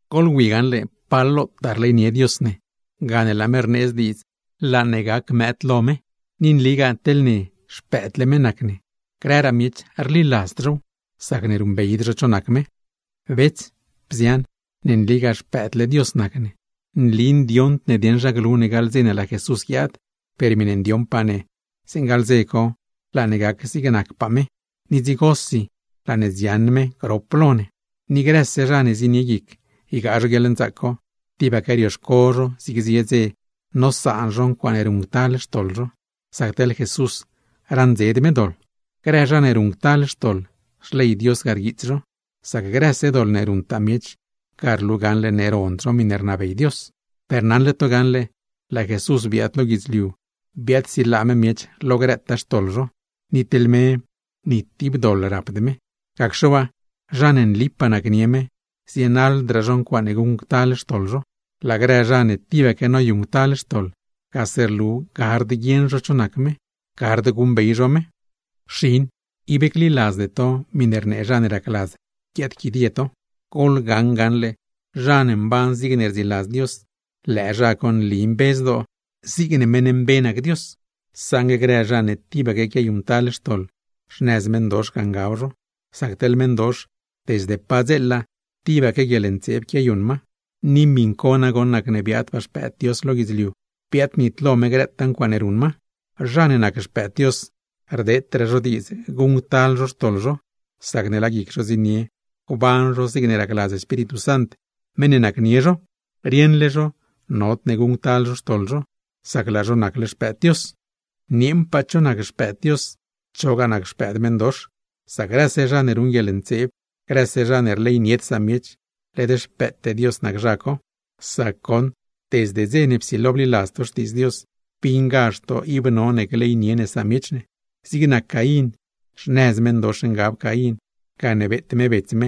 Goḻwi gaṉle pa lotaa rleynie Dios ne, laa me rneedz diidz laa ne gac mëëd lo me. ¡Ni nligaa teḻ ne, xpëëdle me nac ne! Grëraa miech rliladzd zhow, sacne ruṉbeyd zho cho nac me. Bets, bzian, ne nligaa xpëëdle Dios nac ne. Nli ndioṉd ne niina dieṉ zha glu ne gaḻ dze ne laa Jesús guiaad, per miṉe ndioṉpaa ne, zeeṉe gaḻ dze co laa ne gac zigne nacpaa me; ni dzigosi laa ne dziaṉ me grop lo ne. Ni grëse zha ne zienie guic ygaa guieḻnzaac co, tibaque rioxco zho zig zie dze nosaan zho ncuaaṉe ruṉctal xtoḻ zho, sac teḻ Jesús raṉdzed me doḻ. Grë zha ne ruṉctal xtoḻ, xley Dios ga rguiits zho, sac grëse doḻ ne ruṉtaa miech ga rlu gaṉle ne rond zho miṉe rnabey me. Per naṉle to gaṉle, laa Jesús biaad lo guidzliu, biaadsilaa me miech lo grëtaa xtoḻ zho; ni mesi ni tib doḻ rapd me. Gacxe waa, zha ne nlipaa nacnie me, zienaḻdraa zho ncuaaṉe guṉctal xtoḻ zho; laa grë zha ne tibaque noyuṉctal xtoḻ, gase rlu ne gard guieṉ zho cho nac me, gard guṉbey zho me. Xin yeeṉa, ib gliladzde to miṉe rnee zha ne racladz guiaadquidie to. Goḻgaṉ gaṉle, zha ne mban zigne rdziladz Dios, lëë zha co nli mbe zdoo, zigne meṉ mbe nac Dios; saṉgue grë zha ne tibaque quiayuṉctal xtoḻ, xnëz meṉdox ga ngab zho; sac teḻ meṉdox, desde padzeela tibaque guieḻntseeb quiayuṉ ma. Ni miṉ co nagoṉ nacne biaadpaa Xpëëd Dios lo guidzliu, biaadnitlo me grëtaa ncuaaṉe ruṉ ma. Zha ne nac xpëëd Dios, rdeetraa zho diidz guṉctal zho xtoḻ zho, sacne laa guic zho zienie gban zho zigne racladz Espíritu Sant, meṉ ne nacnie zho; rieṉle zho nodne guṉctal zho xtoḻ zho, sac laa zho nacle xpëëd Dios. Nieeṉpaa cho nac xpëëd Dios, chogaa nac xpëëd meṉdox, sac grëse zha ne ruṉ guieḻntseeb, grëse zha ne rleynied samiech, led xpëëte Dios nac zho; sac goṉ, desde dze ne psilo bliladz to Xtiidz Dios, bingazh to ib none gleynie ne samiech ne. Zig nac Caín, xnëz meṉdox ngab Caín, gane beet me bets me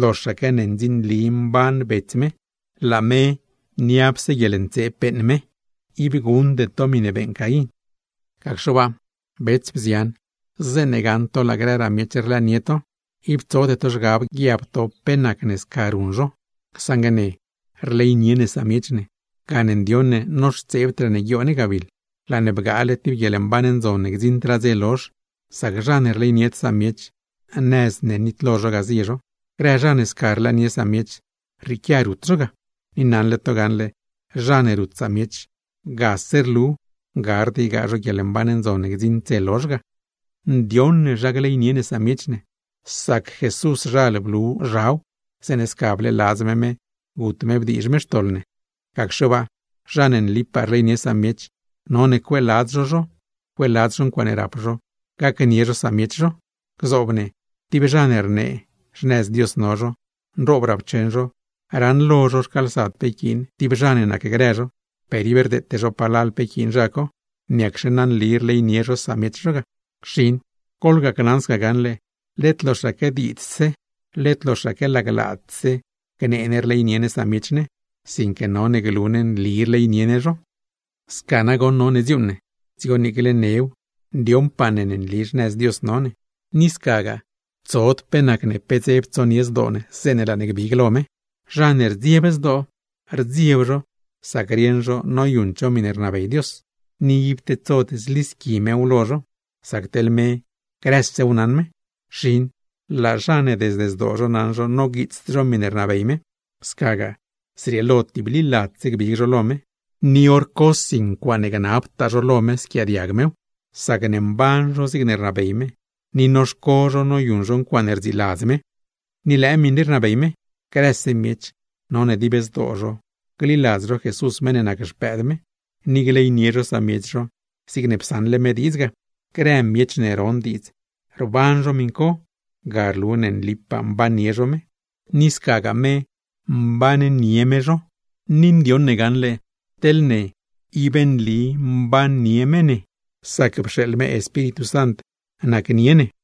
loxaque ne ndzinli mban bets me, laa me niapse guieḻntseeb ruṉ me. Ib guṉde to miṉe beeṉ Caín. Gacxe waa, bets, bzian, zeeṉe gaṉ to laa grëraa miech rlëënie to, ib tsode to zhgab guiab to pe nacne sca ruṉ zho. Saṉgue ne rleynie ne samiech ne, gane ndioṉ ne noxtseebdraa ne guioo ne gabiḻ, laa ne bgaale tib guieḻmban ndzon ne gdziṉdraa dze lozh; sac zha ne rleynied samiech, nëz ne nitlo zho ga zie zho. Grë zha ne sca rlëënie samiech, rrieequia rut zho ga, ni naṉle to gaṉle zha ne rut samiech, gard ygaa zho guieḻmban ndzon ne gdziṉd dze lozh ga. Ndioṉ ne zha gleynie ne samiech ne, sac Jesúszhal blu zhaw zeeṉe sca bleeladz me me gut me bdiizh me xtoḻ ne. Gacxe waa, zha ne nlipaa rleynie samiech, none cueeladz zho zho, cueeladz zho ncuaaṉe rap zho, gacnie zho samiech zho. Gzoob ne, tib zha ne rnee xnëz Dios no zho, nroob rapcheṉ zho, raṉlo zho rcaalsad pe yquiin tib zha ne nacgrë zho, per ib rdeete zho palal pe yquiin zha co. ¿Niacxe na nli rleynie zha co samiech zho ga? Xin yeeṉa, goḻgacnaṉ sca gaṉle, led loxaque diidzdse, led loxaque laglaadse gnee ne rleynie ne samiech ne; sinque none glu ne nli rleynie ne zho. Sca nagoṉ none dziuuṉ ne, dzigo niicle new ndioṉpaa ne nli xnëz Dios no ne, ni scagaa tsod pe nacne pe dzeb tsonie zdoo ne zeeṉe laa ne gbig lo me. Teḻ zha ne rdzieb zdoo, sac rieṉ zho noyuṉd zho miṉe rnabey Dios, ib tedsod zlisqui Diosa lo zho; sac teḻ me grësew naṉ me. Xin yeeṉa, laa zha ne desde zdoo zho naṉ zho noguiitsd zho miṉe rnabey me, scagaa tibliladzse gbig zho lo me; hor cosi ncuaaṉe gnabtaa zho lo me squiaadiag mew, sacne mban zho zigne rnabey me, ni noxco zho noyuṉ zho ncuaaṉe rdziladz me. Ni lëë miṉ rii rnabey me: Grëse miech, none dib zdoo zho gliladz zho Jesús meṉ ne nac Xpëëd me, ni gleynie zho samiech zho zigne psaṉle me diidz ga. Grë zha ne ron diidz ruṉ miṉ co, ga rlu ne nlipaa mbannie zho me, ni scagaa me mbannie me zho. Ni ndioṉ ne gaṉle, ib nli mbannie me ne, sac pxeeḻ me Espíritu Sant nacnie ne.